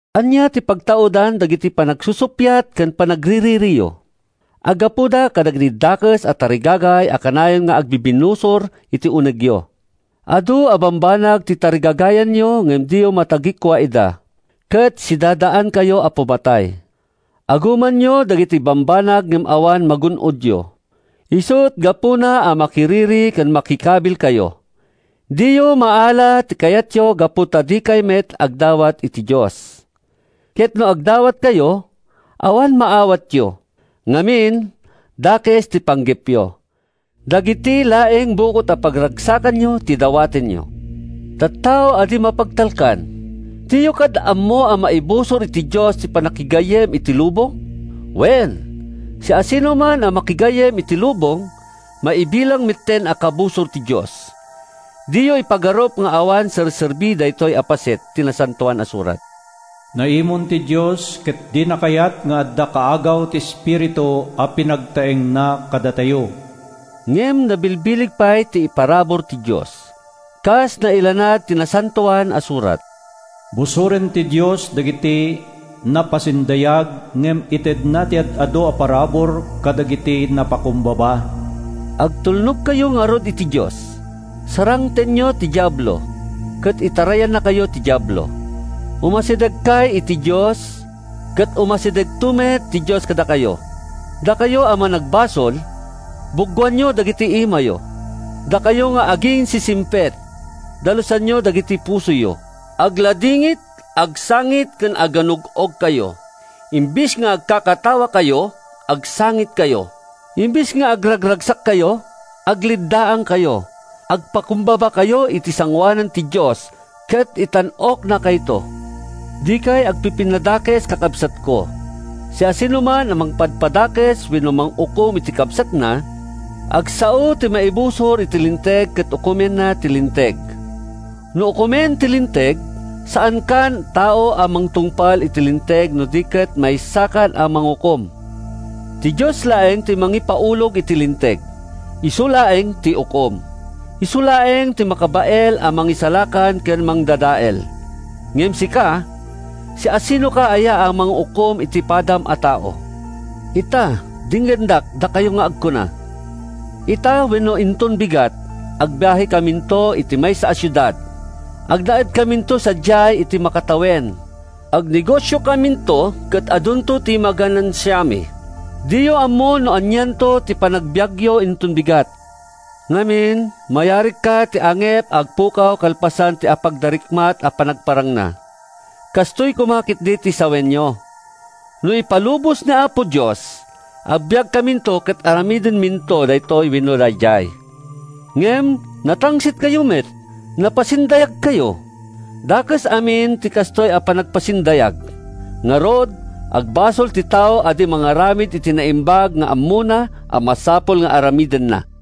Ania ti pagtaudan dagiti panagsusuppiat ken panagriririyo? Aggapuda kadagiti dakes a tarigagay a kanayon nga agbibinnusor iti unegyo. Adu a bambanag ti tarigagayanyo ngem diyo matagikua ida, ket sidadaankayo a pumatay. Agumanyo dagiti bambanag ngem awan magun-odyo, isut’ gapuna a makiriri ken makikabilkayo. Diyo maala ti kayatyo gapu ta dikay met agdawat iti Dios. Ket no agdawatkayo, awan maawatyo. Ngamin, dakes ti panggepyo; dagiti laeng bukod a pagragsakanyo ti dawatenyo. Tattao a di mapagtalkan! Diyo kad ammo a maibusor iti Dios ti pannakigayyem iti lubong? Wen, siasinoman a makigayyem iti lubong, maibilang metten a kabusor ti Dios. Diyo ipagarup nga awan serserbi daytoy a paset ti Nasantoan a Surat: “Naimon ti Dios ket dina kayat nga adda kaagaw ti espiritu a pinagtaengna kadatayo.” Ngem nabilbileg pay ti iparabur ti Dios. Kas nailanad iti Nasantoan a Surat: “Busoren ti Dios dagiti napasindayag ngem itedna ti ad-adu a parabur kadagiti napakumbaba.” Agtulnogkayo ngarud iti Dios. Sarangtenyo ti Diablo, ket itarayannakayto ti Diablo. Umasidegkay iti Dios, ket umasidegto met ti Dios kadakayo. Dakayo a managbasol, buggoanyo dagiti imayo! Dakayo nga aginsisingpet, dalusanyo dagiti pusoyo! Agladingit, agsangit ken aganug-ogkayo. Imbes nga agkakatawakayo, agsangitkayo. Imbes nga agraragsakkayo, agleddaangkayo. Agpakumbabakayo iti sangoanan ti Dios, ket itan-oknakayto. Dikay agpipinnadakes, kakabsatko. Siasinoman a mangpadpadakes wenno mangukom iti kabsatna, agsao iti maibusor iti Linteg ket ukomenna ti Linteg. No ukomem ti Linteg, saankan a tao a mangtungpal iti Linteg no di ket maysakan a mangukom. Ti Dios laeng ti mangipaulog iti Linteg. Isu laeng ti ukom. Isu laeng ti makabael a mangisalakan ken mangdadael. Ngem sika, siasinoka aya a mangukom iti padam a tao? Ita, denggendak, dakayo nga agkuna: “Ita wenno inton bigat, agbiahekaminto iti maysa a siudad. Agnaedkaminto sadiay iti makatawen. Agnegosiokaminto ket adunto ti maganansiami.” Diyo ammo no anianto ti panagbiagyo inton bigat! Ngamin, mayarigkay iti angep nga agpukaw kalpasan ti apagdarikmat a panagparangna. Kastoy koma ketdi ti sawenyo: “No ipalubos ni Apo Dios, agbiagkaminto ket aramidenminto daytoy wenno daydiay.” Ngem natangsitkayo met. Napasindayagkayo. Dakes amin ti kastoy a panagpasindayag. Ngarud, agbasol ti tao a di mangaramid iti naimbag nga ammona a masapul nga aramidenna.